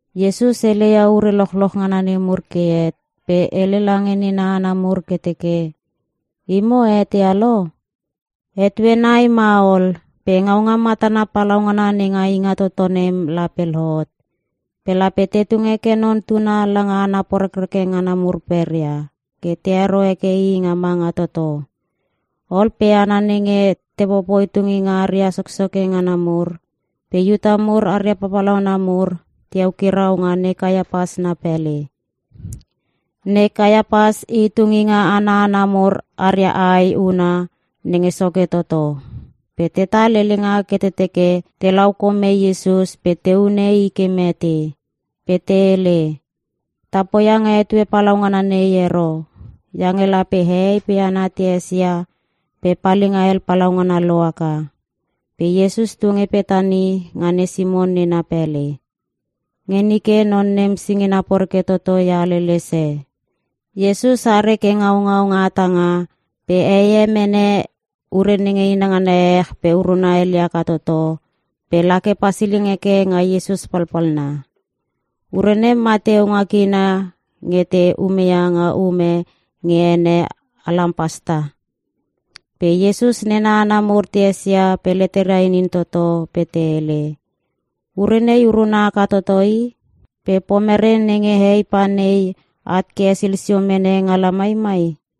Iesus hele ia ure lochloch ngana nemur ke het pe hele lange nena hana mur ke teke, “Imo a eteia lo? Etue nai ma ol, pe ngaunga matana palaungana nenga Ingatoto nem lape lohot. Pe lape te tung heke Non Tuna langa hana porekreke ngana mur peria, ke te hero heke I nga manga toto.” Ol pe hana nenge te popoi tunginga aria soksoke ngana mur, pe Iuta mur aria papalauna mur, te eukirau nga ne Kaiapas na pele. Ne Kaiapas i tunginga ana hana mur aria ae huna nenge soke toto. Pe tetal helenga ke te teke te lau kome Iesus pe te hune I ke mete. Pe te hele, “Ta poia nga etue palaungana nei ero, iange lape hehei pe hana te esia pe palinga hel palaungana lohaka.” Pe Iesus tu nge Petani nga ne Simon nena pele. Nge nike, non nem singina poreke toto ia haleles e. Iesus are ke ngaungau nga hatanga, pe heie mene ure nenge inangana ehech pe uruna ele aka toto, pe la ke pasiling heke nga Iesus palpalna. (Ure nem mateu nga kina nge te umeia nga um e nge ene alampasta.) Pe Iesus nena hana mur te esia pe leteria inin toto pe te hele, “Ure nei uruna haka toto i, pe pomere nenge hei pa nei at ke hesil sio mene nga lamai mai?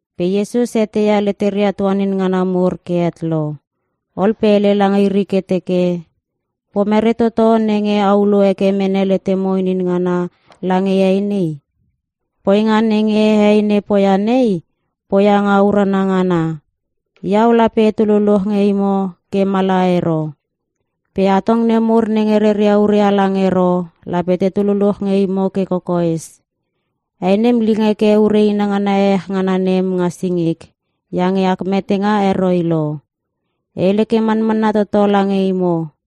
Pe Iesus eteia leteria tuanin ngana mur ke het lo. Ol pe hele lange iri ke teke, “Pomere toto nenge a ulo heke mene letemo inin ngana lange hei nei? Poinga nenge hei nei poia nei, poia nga urana ngana. Iau lape etu luluch nge imo ke mala ero. Pe atong nemur nenge reria ure halang ero lape tetu luluch nge imo ke kokoes. Hei nem ling heke ure inangana ehech ngana nem nga singik, iange ak metenga heroi lo. E hele ke manmanna toto lange imo,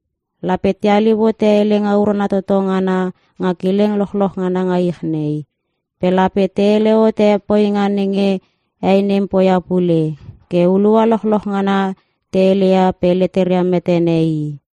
lape te haliu hote Helenga Urana Toto Ngana nga kileng lochloch ngana nga ich nei, pe lape te hele hote poinga nenge hei nei poia pule, ke hulua lochloch ngana te hele ia pe leteria metene i.”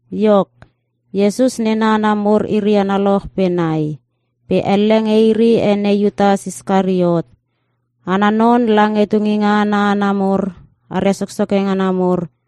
Iok, Iesus nena hana mur iri analoch pe nai. Pe elle nge iri ene Iutas Iskariot. Ana non, lange tunginga ana hana mur aria soksoke ngana mur,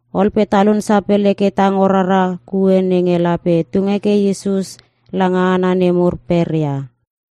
Ol pe talun sapele ke tango rara kue nenge lape tung heke Iesus langa hana nemur peria.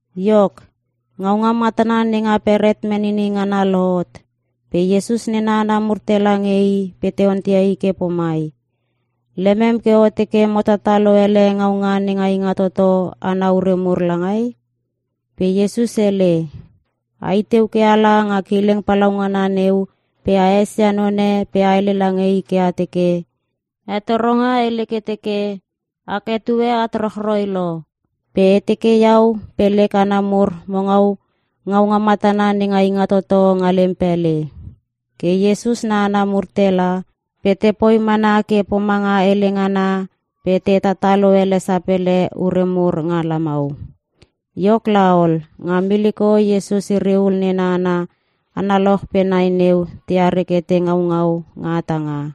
Iok, ngaunga matana nenga Beret Menini Ngana lohot, pe Iesus nena hana mur tela nge I pe te onteia I ke pomai, “Lemem ke o teke mo tatalo ele ngaunga nenga Ingatoto ana ure mur langai?” Pe Iesus hele, “A iteu ke ala nga kileng palaungana neu pe a esia none pe a hele lange i ke a teke, ‘Hetoronga hele ke teke: Ak etue at rochroi lo, pe e teke Iau pe lek hana mur mo ngaua ngaunga matana nenga Ingatoto nga lem pele.’” Ke Iesus na hana mur tela pe te poi mana ke pomanga hele ngana pe te tatalo ele sapele ure mur nga lamau. Iok laol, nga miliko Iesus iri ul nena hana analoch pe nai neu teare ke te ngaungau nga hatanga.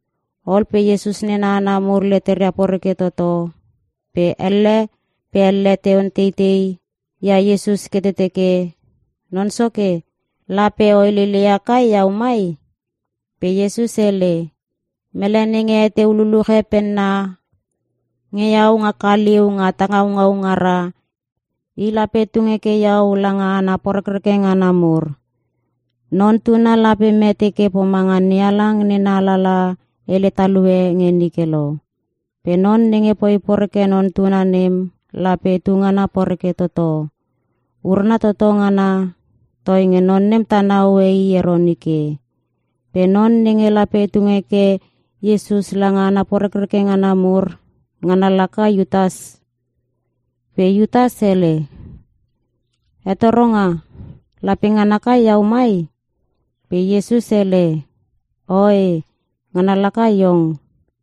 Ol pe Iesus nena hana mur leteria poreke toto, pe elle pe elle te onteitei ia Iesus ke te teke, “Non Soke, lape o heleleia kai iau mai?” Pe Iesus hele, “Mele nenge heteu luluche penna nge Iau nga kaliu nga ta ngaungau ngara, i lape tung heke Iau lange hana porekreke ngana mur. Non Tuna lape mete ke pomanga NeHalang Nena Alalaha hele talue nge nike lo. Pe non nenge poi poreke Non Tuna nem lape tungana poreke toto. Urana toto ngana, toinge non nem tana hoe i ero nike.” Pe non nenge lape tung heke Iesus lange hana porekreke ngana mur, ngana laka Iutas. Pe Iutas hele, “Hetoronga, lape ngana kai iau mai?” Pe Iesus hele, “Oe, ngana laka iong.”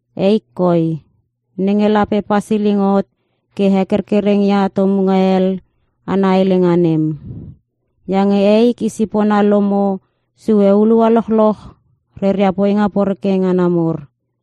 Eik koi, nenge lape pasiling hot ke hekerkereng ia Tomunga hel ana Helenga nem. Iange eik i sipona lomo sue hulua lochloch reria poinga poreke ngana mur.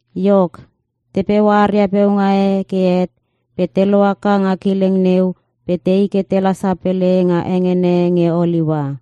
Iok, te peua aria peunga e ke het pe te lohaka nga kileng neu pe tei ke tela sapele nga hengene nge Oliua.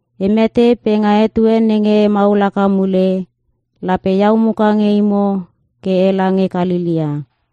E mete pe nga etue nenge e maul haka mule, lape Iau muka nge imo ke ela nge Kalelea.”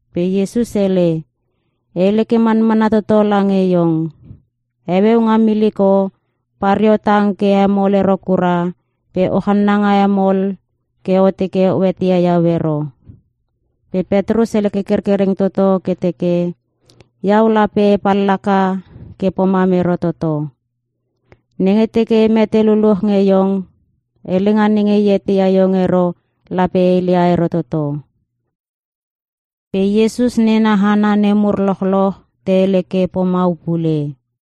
Pe Iesus hele, “E hele ke manmanna toto lange iong. Heueu nga miliko, pareo tang ke hemol ero kura pe o channanga hemol ke o teke o eteia Iau ero.” Pe Petrus hele ke kerkereng toto ke teke, “Iau lape e pallaka ke pomam ero toto! Nenge teke e mete luluch nge iong, helenga nenge e eteia iong ero lape e heleia ero toto!” Pe Iesus nena hana nemur lochloch te hele ke pomau pule.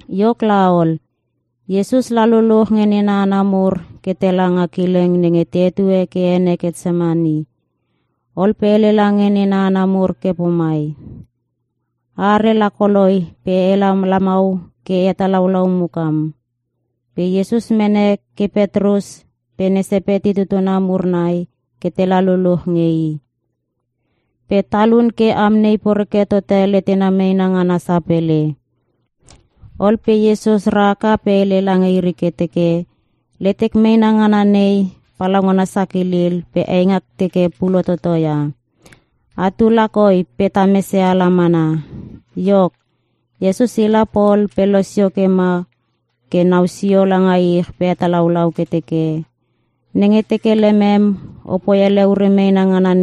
Iok laol, Iesus la luluch nge nena hana mur ke tela nga kileng nenge te hetue ke ene Ketsemani. Ol pe hele lange nena hana mur ke pomai, “A are lakoloi pe ela lamau ke e hetalaulau mukam.” Pe Iesus mene ke Petrus pe ne Sepeti tutuna mur nai ke tela luluch nge i. Pe talun ke amnei poreke tote letena meena ngana sapele. Ol pe Iesus rahaka pe hele lange iri ke teke, “Letek meena ngana nei, palaugana sakilil pe eingak teke pulo toto ia. Atu lakoi pe ta mese ala mana.” Iok, Iesus ila pol pe losio pe ma ke nau sio langa ich pe hetalaulau ke teke, “Nenge teke lemem, opoi ele ure meena ngana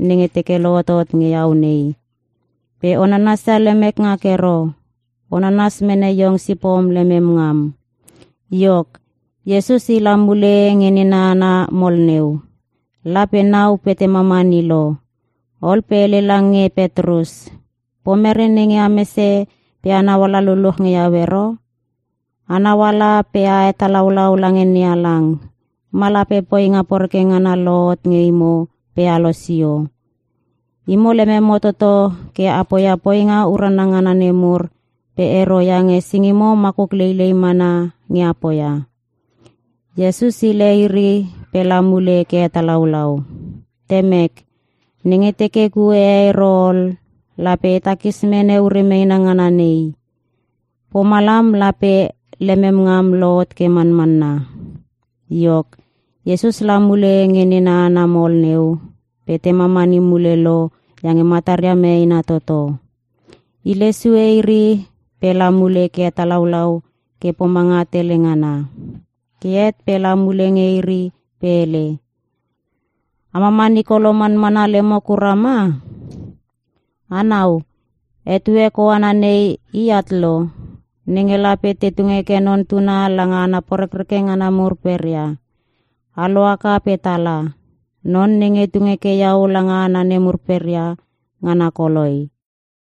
nenge teke lohotot nge Iau nei. Pe o nanasia lemek ngak ero. O nanas mene iong sipom lemem ngam.” Iok, Iesus ila mule nge nena hana mol neu. La pe nau pe te mamani lo. Ol pe hele lange Petrus, “Pomere nenge a mese pe a nauala luluch nge iau ero? Anau ala pe a hetalaulau lange NeHalang, ma lape poinga poreke ngana lohot nge imo pe a losio. Imo lememo toto ke a poia poinga urana ngana nemur pe ero iange singimo makuk leilei mana nge a poia.” Iesus hile iri pe la mule ke hetalaulau, “Temek, nenge teke kue e ero ol lape e takis mene ure meena ngana nei. Pomalam lape lemem ngam lohot ke manmanna.” Iok, Iesus la mule nge nena hana mol neu pe te mamani mule lo iange mataria meena toto. Hile sue iri pe la mule ke hetalaulau ke pomanga tele ngana. Ke het pe la mule nge iri pe hele, “A mamani kolo manmana lemo kura ma?! A nau, etue koana nei i at lo, nenge lape te tung heke Non Tuna langa hana porekreke ngana mur peria. A lohaka pe tala. Non nenge tung heke Iau langa hana nemur peria, ngana koloi.”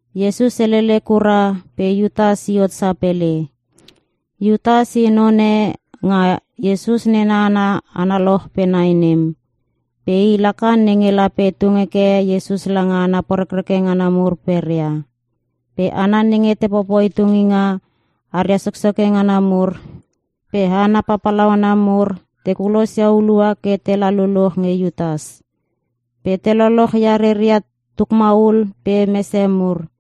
Iesus helele kura pe Iutas i hot sapele. Iutas i none nga Iesus nena hana analoch pe nai nem. Pe i laka nenge lape tung heke Iesus langa hana porekreke ngana mur peria. Pe hana nenge te popoi tunginga aria soksoke ngana mur pe hana papalauna mur te kulos ia hulua ke tela luluch nge Iutas. Pe te loloch ia reria tukmaul pe mese mur.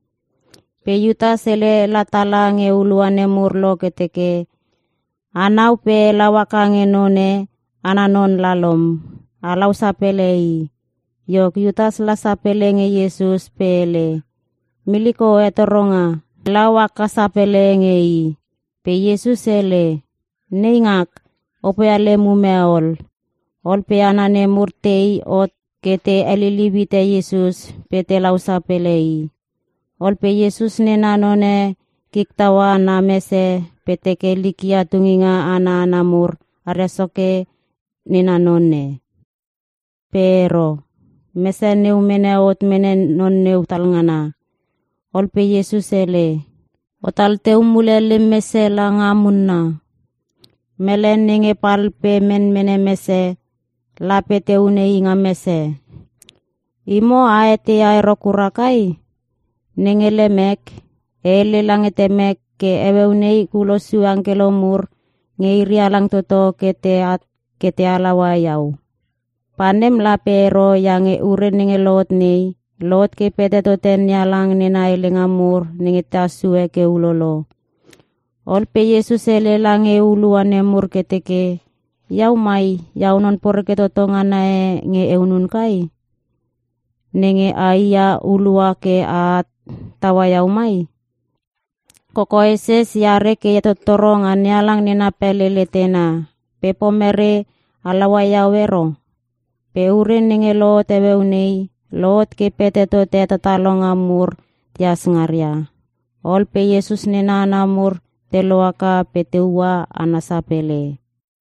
Pe Iutas hele la tala nge hulua nemur lo ke teke, “A nau pe e lau haka nge none, ana non lalom. Alau sapele i.” Iok, Iutas la sapele nge Iesus pe hele, “Miliko hetoronga.” Pe lau haka sapele nge I. Pe Iesus hele, “Neingak, o poia lem ume ol.” Ol pe hana nemur tei hot ke te heliliu hite Iesus pe te lau sapele I. Ol pe Iesus nena none kik taua na mese pe teke likia tunginga ana hana mur aria soke nena none. Pe ero, mese neu mene hot mene non neu talngana. Ol pe Iesus hele, “O tal teu mule lem mese langa munna. Mele nenge pal pe menmene mese lape te hune i nga mese. Imo a eteia ero kura kai? Nenge lemek, e hele lange Temek pe heueu nei kulos sue angkelo mur nge iri halang toto ke te at ke te halaua Iau. Pe nem lape ero iange ure nenge lohot nei, lohot ke pete tote NeHalang nena helenga mur nenge tehas sue ke ulolo.” Ol pe Iesus hele lange hulua nemur ke teke, “Iau mai, Iau non poreke toto ngana e nge e hunun kai, nenge ai ia hulua ke aat taua Iau mai? Kokoeses e are ke e hetottoro nga NeHalang nena pele letena. Pe pomere a laua iau ero? Pe ure nenge lohot heueu nei, lohot ke pete tote hetatalonga mur tehas ngaria.” Ol pe Iesus nena hana mur te lohaka pe te ua ana sapele.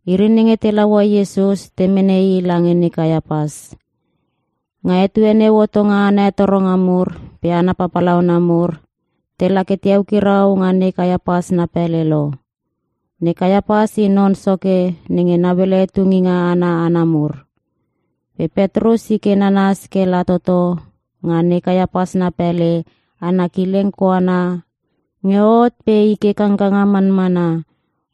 Iri nenge te laua Iesus te mene I lange ne Kaiapas. Nga etue neu hotonga ana hetoronga mur pe hana papalauna mur, tela ke te eukirau nga ne Kaiapas na pele lo. Ne Kaiapas i non soke nenge nauele tunginga ana hana mur. Pe Petrus i ke nanas ke la toto nga ne Kaiapas na pele ana kileng koana nge hot pe i ke kangkanga manmana.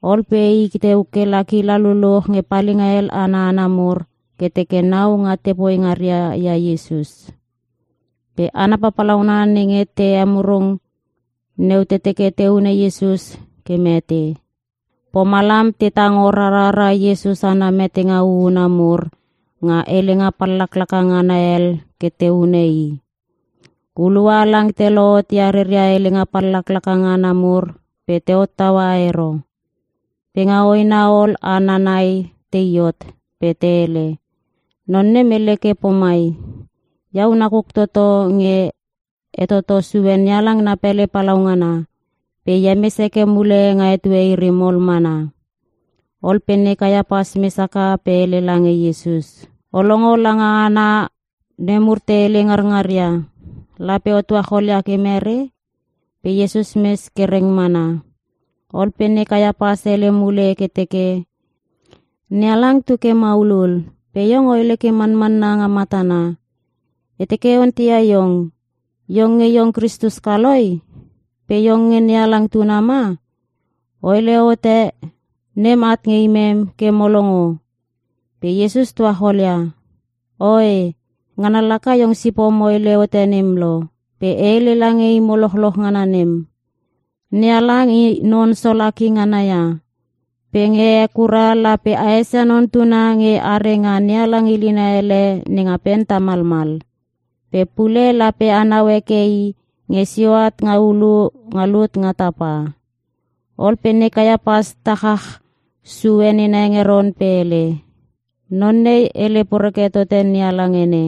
Ol pe i teu kela kila luluch nge palinga hel ana hana mur ke teke nau nga te poi ngaria ia Iesus. Pe hana papalauna nenge te hemurung neu te teke te hune Iesus ke mete. Pomalam te tango rarara Iesus ana metenga huhuna mur nga helenga pallaklaka ngana hel ke te hune i. Hulua halang te lohot ia reria helenga pallaklaka ngana mur pe te hottaua ero. Pe nga hoena ol hana nai tei hot pe te hele, “Non nem hele ke pomai, ‘Iau nakuk toto nge e toto sue NeHalang na pele palaungana, pe e hemes heke mule nga etue iri mol mana.’” Ol pe ne Kaiapas mes haka pe hele lange Iesus, “O longo langa hana nemur te hele ngarngaria? Lape o tuachol ia ke mere?” Pe Iesus mes ke reng mana. Ol pe ne Kaiapas hele mule ke teke, “NeHalang tu ke maulul pe iong o hele ke manmanna nga matana. E teke e onteia iong. Iong nge iong Kristus kaloi? Pe iong nge NeHalang tuna ma? O hele hote nem at nge imem ke mo longo.” Pe Iesus tuacholia, “Oe, ngana laka iong sipom o hele hote nem lo. Pe e hele lange imo lochloch ngana nem: NeHalang i non Solaki ngana ia. Pe nge he kura lape a esia Non Tuna nge are nga NeHalang ilina ele nenga pen tamalmal. Pe pule lape anau heke I nge sio at nga ulu nga lut nga tapa.” Ol pe ne Kaiapas tachach sue nena hengeron pe hele, “Non nei hele poreke tote NeHalang ene!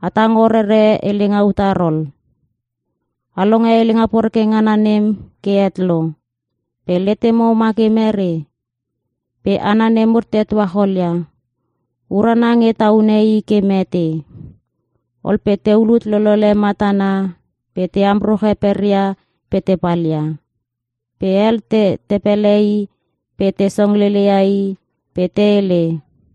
A tango rere helenga utar ol? A longe helenga poreke ngana nem ke het lo! Pe letemo ma ke mere?” Pe hana nemur te tuachol ia, “Urana nge ta hune I ke mete.” Ol pe te ulut lolele matana pe te amruche peria pe te palia. Pe hel, te tepelehe i pe te songlele ia i pe te hele,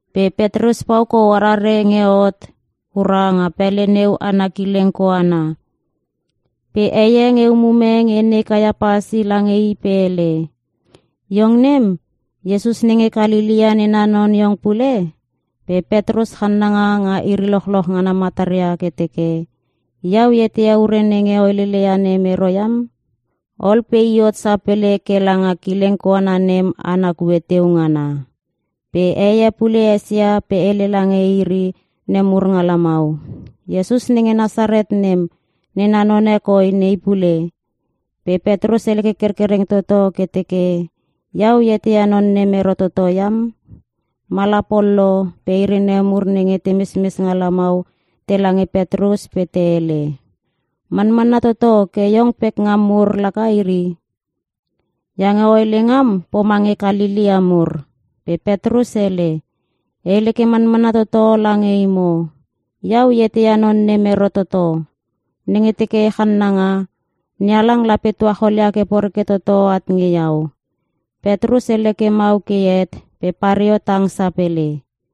Pe Petrus pau kou arare nge hot kura nga pele neu ana kileng koana. Pe heie nge umume nge ne Kaiapas i lange i pe hele, “Iong nem, Iesus nenge Kalelea nena non iong pule.” Pe Petrus channanga nga iri lochloch ngana mataria ke teke, “Iau e eteia ure nenge o helele ia nem ero iam.” Ol pe i hot sapele ke langa kileng koana nem ana kue teu ngana. Pe heie pule esia pe hele lange iri nemur nga lamau, “Iesus nenge Nasaret nem, nena none koi nei pule.” Pe Petrus hele ke kerkereng toto ke teke, “Iau e eteia non nem ero toto iam!” Mala pol lo pe iri nemur nenge te mesmes nga lamau tela nge Petrus pe te hele, “Manmanna toto ke iong pekngam mur laka iri. Iange o hele ngam pomange Kalelea mur.” Pe Petrus hele, “E hele ke manmanna toto lange imo. Iau e eteia non nem ero toto. Nenge teke e channanga, NeHalang lape tuacholia ke poreke toto at nge iau.” Petrus hele ke mau ke het pe pareo tang sapele.